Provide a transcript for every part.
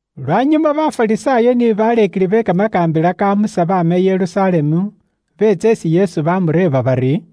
Lwanyuma Bafarisaayo ni baleekeli be kamakaambila ka Musa baama i Yerusalemu, beetsa isi Yesu baamureeba bari,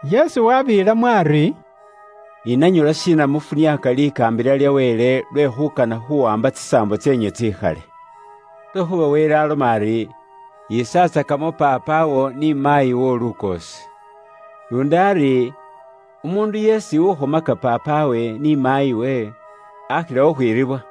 Yesu wabeelamo ari, “Ni nanywe lwashiina mufuniaaka likaambila lya Wele lwe khuukana khuwaamba tsisaambo tseenywe tsikhale? Lwekhuuba Wele aloma ari, ‘Yiisatsakamo paapawo ni maayi woowo lukoosi,’ luundi ari, ‘Umuundu yeesi ukhomaka paapawe ni maayiwe, akhila khukhwiribwa.’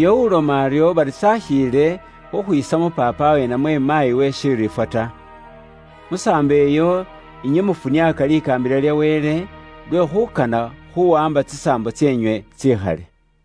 Uyo uloma aryo bari s'akhiile khukhwiisamo paapawe, namwe maayiwe shiriifwa ta. Musaambo iyo inywe mufuniaaka likaambila lya Wele lwe khuukana khuuwaamba tsisaambo tseenywe tsikhale.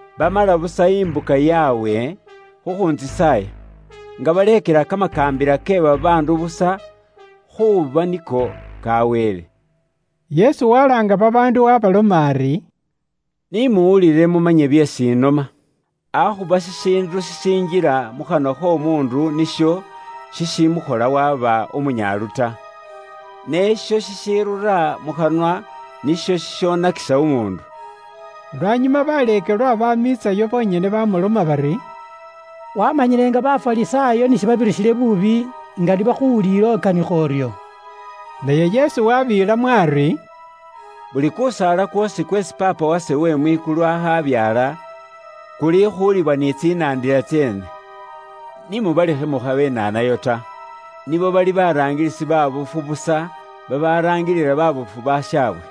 Bamala busa imbuka yaabwe khukhuuntsisaaya, nga baleekela kamakaambila ke babaandu busa khuuba niko ka Wele.’” Yesu walaanga babaandu waabaloma ari, “Ni muwulile mumanye byeesi ise inoma. Akhuba shishiindu shishinjila mukhanwa kh'omuundu nisho shishimukhola waba umunyaalu ta, ne isho shishirura mukhanwa nisho shishonakisa umuundu.” Lwanyuma baleekelwa bamwiitsayo bonyene bamuloma bari, “Wamanyile nga Bafarisaayo shibabirisile buubi nga ni bakhuwuliile ukanikha uryo?” Naye Yesu wabeelamo ari, “Buli kusaala kwoosi kweesi Paapa wase uwe mwikulu akhabyaala, kulikhuuliwa ni tsinandila tseene. Ni mubalekhe mukhabenaanayo ta. Nibo bali baraangilisi baabofu busa babaraangilila baabofu bashaabwe.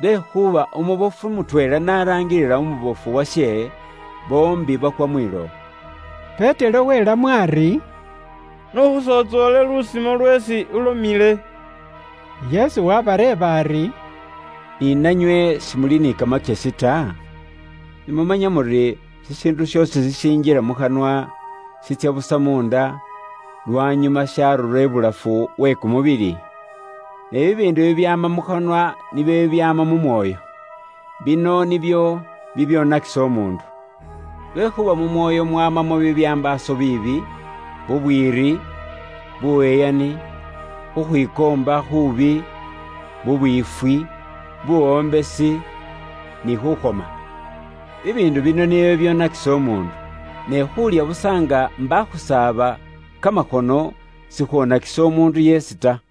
Lwekhuuba umubofu mutweela n'araangilila umubofu washe, boombi bakwa mwilowo.” Petero welamo ari, “N'ukhusontsoole lusimo lweesi ulomile.” Yesu wabareeba ari, “Ni nanywe si muli ni kamakyesi ta? Si mumanya muri shishiindu shoosi shishinjila mukhanwa, shitsya busa munda, lwanyuma sharura ibulafu shaatsya mu khayu ta? Ne bibiindu bibyaama mukhanwa nibyo byaama mu mwoyo, bino nibyo bibyoonakisa umuundu. Lwekhuuba mu mwoyo nimwo mumwamamwo bibyambaaso biibi, bubwiiri, buyeyani, khukhwikoomba khuubi, bubwiifwi, buwombesi, ni khufwotsola. Bibiindu bino nibyo bibyoonakisa umuundu, ne khuulya busa nga mbakhusaaba kamakhono sikhwonakisa umuundu yeesi ta.”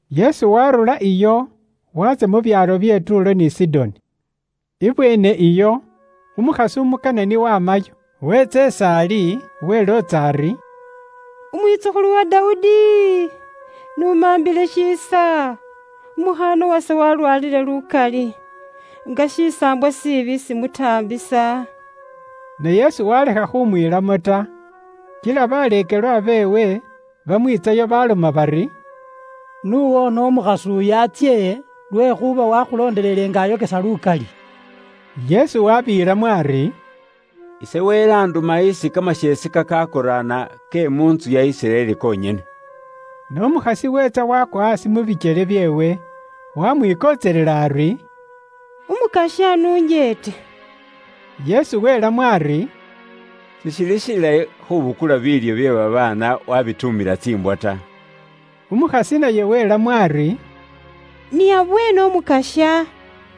Yesu waarurayo iyo, waatsya mu byaalo bye Tuulo ni Sidoni. Ibweene iyo umukhasi umu Kanani wamayo, weetsa is'ali, welootsa ari, “Umwitsukhulu wa Dawudi, n'umambile shiisa, umukhaana wase walwaalile lukali, kimisaambwa kimutaambisa.” Ne Yesu waalekha khumwiilamo ta. Kila baleekelwa beewe bamwiitsayo baloma bari, “N'uwoone umukhasi uyu atsye, lwekhuuba wakhulondelele nga ayokesa lukali.” Yesu wabeelamo ari, “Ise Wele anduma isi kamasheese kakaakoraana ke mu ntsu ya Isiraeli konyene.” Ne umukhasi weetsa waakwa aasi mu bikyele byeewe, waamwikontselela ari, “Umukasya, n'unjeete.” Yesu welamo ari, “Sishili shilayi khubukula biilyo bye babaana wabituumila tsiimbwa ta.” Umukhasi naye welamo ari, “Ni abweene Umukasya,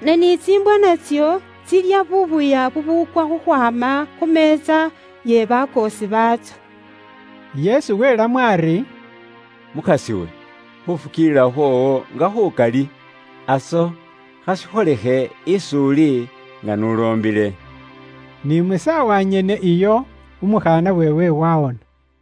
ne ni tsiimbwa natso tsilya buubuya bubuukwa khukhwaama khu meetsa ye bakoosi baatso.” Yesu welamo ari, “Mukhas'iwe khufukiilila khwoowo nga khukali! Aso, khashikholekhe is'uli nga n'uloombile.” Ni mu saawa nyene iyo, umukhaana weewe wawona.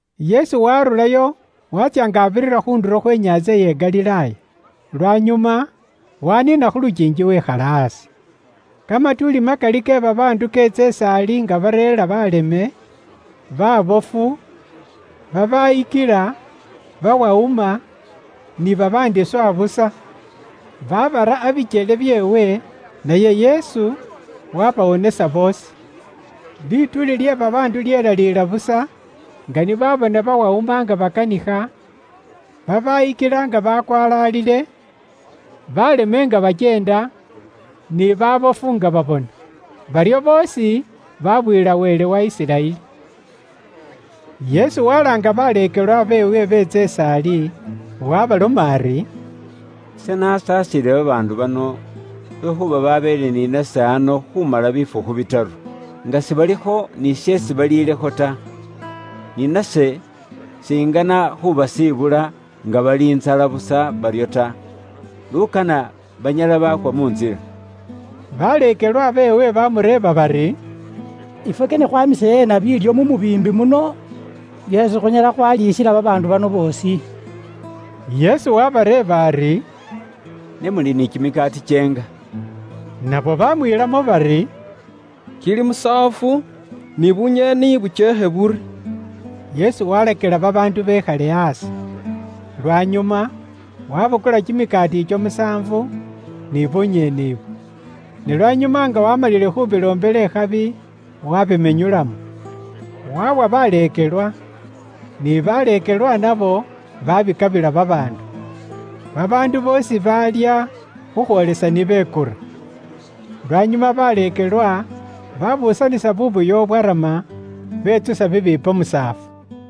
Yesu waarurayo waatsya nga abirira khu ndulo khwe inyaantsa iye Galilaaya. Lwanyuma waniina khu lukiingi wekhala aasi. Kamatuuli makali ke babaandu keetsa is'ali nga bareera baleme, baabofu, babaayikila, bawawuma, ni babaandi swa busa, baabara abikyele byeewe; naye Yesu waabawonesa boosi. Lituuli lye babaandu lyelaliila busa, nga ni baabona bawawuma nga bakanikha, babaayikila nga bakwalaalile, baaleme nga bakyeenda, ni baabofu nga babona. Baryo boosi baabuyila Wele wa Isiraeli. Yesu walaanga baleekelwa beewe beetsa is'ali, waabaloma ari, “Ise nasasiile babaandu bano, lwekhuuba babeele ni nase ano khumala bifukhu bitaru, nga sibalikho ni sheesi baliilekho ta. Ni nase shingana khubasibula nga bali ntsala busa baryo ta, lukana banyala baakwa mu ntsila.” Baleekelwa beewe bamureeba bari, “Ifwe kane khwamise eena biilyo mu mubiimbi muno byeesi khunyala khwaliisila babaandu bano boosi?” Yesu wabareeba ari, “Ne muli ni kimikaati kyeenga?” Nabo bamwiilamo bari, “Kili musaafu, ni bunyeeni bukyeekhe buri.” Yesu walakila babaandu bekhale aasi. Lwanyuma wabukula kimikaati ikyo musaafu, ni bunyeeni ibwo. Ne lwanyuma nga waamalile khubiloombela ikhabi wabimenyulamo, wawa baleekelwa, ni baleekelwa nabo babikabila babaandu. Babaandu boosi baalya, khukhwoolesa ni bekura. Lwanyuma baleekelwa babuusanisa buubuya bubwarama, bwetsula bibiipo musaafu.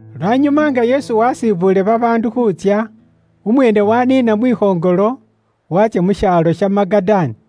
Lwanyuma nga Yesu waasibuule babaandu khuutsya, umweene waaniina mwikhoŋolo, waatsya mu shaalo sha Magadani.